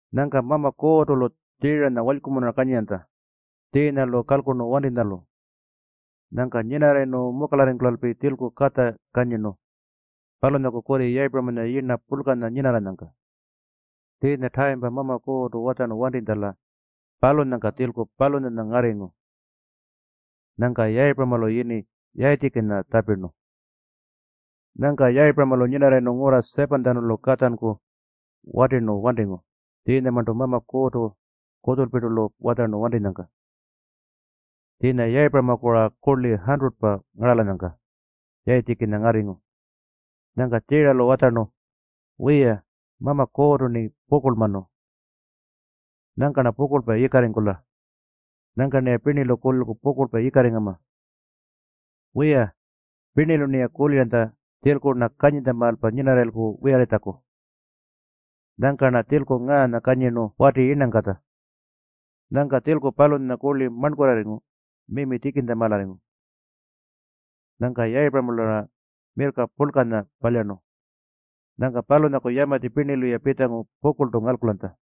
Nyangka Mama Kuurrtu-lu Tjiiranya walykumunura kanyiranytja tjiinya-lu kalkurnu wantinytjalu. Nyangka nyinarrayirnu mukalarringkulalpi tjilku katja kanyirnu palunyaku kurri Yayipuramanya yirna purlkanya nyinarranyangka. Tjiinya tayimpa Mama Kuurrtu watjarnu wantitjala, palunyangka tjilku palunyanya ngarringu. Nyangka Yayipuramalu yini Yayitjikinya tjapirnu. Nyangka Yayipuramalu nyinarrayirnu ngurra 7-tjanulu katjanku watirnu wantingu tjiinyamarntu Mama Kuurrtu kutjulpirtu-lu watjarnu wantinyangka. Tjiinya Yayipuramaku-ra kurli 100-pa ngaralanyangka Yayitjikinya ngarringu. Nyangka Tjiiralu watjarnu, “Wiya, Mama Kuurrtu-rni pukurlmanu. Nyangka-rna pukurlpa yikarringkula. Nyangka-rniya pirnilu kulilku pukurlpa yikarringama. Wiya, pirnilu-rniya kuliranytja tjilku-rna kanyintjamaalpa nyinarrayilku wiyarritjaku. Nyangka-rna tjilku ngaanya kanyirnu wati yirnangkatja.” Nyangka tjilku palunyanya kurli marnkurrarringu mimi tjikintjamaalarringu. Nyangka Yayipuramalu-ra mirrka purlkanya palyarnu. Nyangka palunyaku yamatji pirnilu-ya pitjangu pukurltu ngalkulanytja.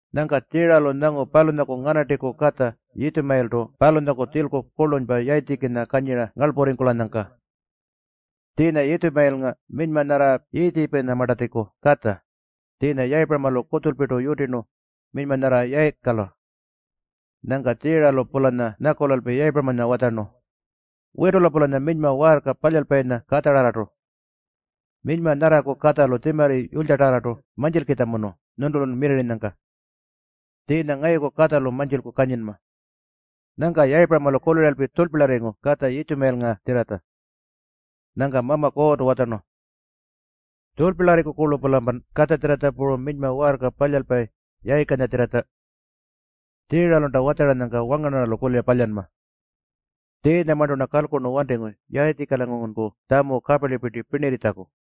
Nyangka Tjiiralu nyangu palunyaku nganartiku katja Yitjumayiltu palunyaku tjilku kurlunypa Yayitjikinya kanyira ngarlpurringkulanyangka. Tjiinya Yitjumayilnga minyma nyarra Yiitjipunyamartatjiku katja, tjiinya Yayipuramalu kutjulpirtu yutirnu minyma nyarra Yayikala. Nyangka Tjiiralu-pulanya nyakulalpi Yayipuramanya watjarnu, “Witula-pulanya minyma waarka palyalpayinya katjararrartu. Minyma nyarraku katjalu tjimarri yulytjatarrartu mantjilkitjamunu nyuntulun wiyarrinyangka. Tjiinya ngayuku katjalu mantjilku kanyinma.” Nyangka Yayipuramalu kuliralpi tjurlpilyarringu katja Yitjumayilngatjirratja. Nyangka Mama Kuurrtu watjarnu, “Tjurlpilyarriku-kurlu-pulampan katjatjirratja puru minyma waarka palyalpayi Yayikanyatjirratja. Tjiiralunta watjaranyangka wangarnarralu kulira palyanma. Tjiinyamarntu-rna kalkurnu wantingu Yayitjikilangurunku tjamu kaparlipirti pirnirritjaku.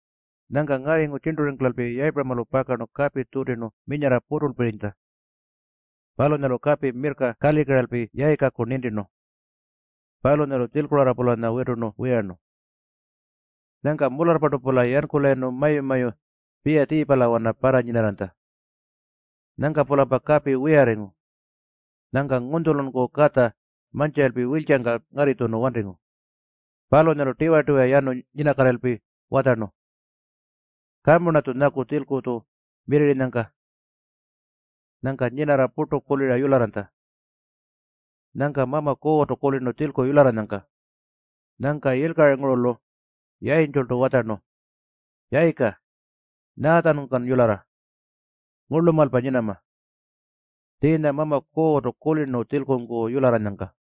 Nyangka ngarringu tjirnturringkulalpi Yayipuramalu pakarnu kapi tjutirnu minyarra puturlpirinytja. Palunyalu kapi, mirrka kalikiralpi Yayikaku nintirnu. Palunyalu tjilkurarra-pulanya witurnu wiyarnu. Nyangka mularrpartu-pula yankulayirnu mayu-mayu Piyatjiipalawana parranyinarranytja. Nyangka-pulampa kapi wiyarringu. Nyangka ngunytjulunku katja mantjiralpi wiltjangka ngarritjunu wantingu. Palunyalu tiwa-tiwa yanu nyinakatirralpi watjarnu, “Kamu-rnatju nyaku tjilku-tju mirrirrinyangka.” Nyangka nyinarra purtu kulira yularranytja. Nyangka Mama Kuurrtu kulirnu tjilku yularranyangka. Nyangka yilkaringurulu yayintjultu watjarnu, “Yayika, nyaatjanungkan yularra? Ngurlumaalpa nyinama. Tjiinya Mama Kuurrtu kulirnu tjilkunku yularranyangka.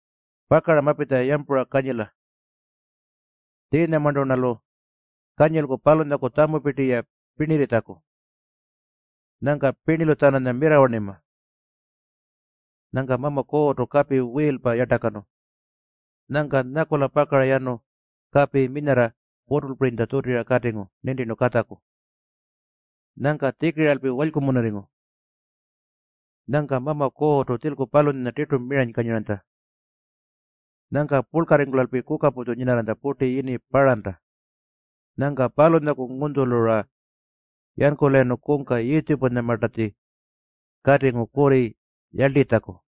Pakara mapitja yampuralpi kanyila. Tjiinyamarntu-rnalu kanyilku palunyaku tjamupirti-ya pirnirritjaku. Nyangka pirnilu-tjananya mirrawarnima.” Nyangka Mama Kuurrtu kapi wiilpa yartakanu. Nyangka nyakula pakara yanu kapi minyarra puturlpirinytja tjutira katingu nintirnu katjaku. Nyangka tjikiralpi walykumunurringu. Nyangka Mama Kuurrtu tjilku palunyanya tirtu miranykanyiranytja. Nyangka purlkarringkulalpi kukaputju nyinarranytja purti yini Paranta. Nyangka palunyaku ngunytjulu-ra yankulayirnu kungka Yiitjipunyamartatji katingu kurri yarltitjaku.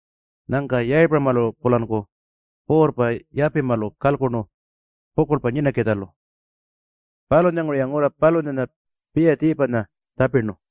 Nyangka Yayipuramalu-pulanku puurrpa Yapimalu kalkurnu pukurlpa nyinakitjalu. Palunyanguru-ya ngurra palunyanya Piyatjiipanya tjapirnu.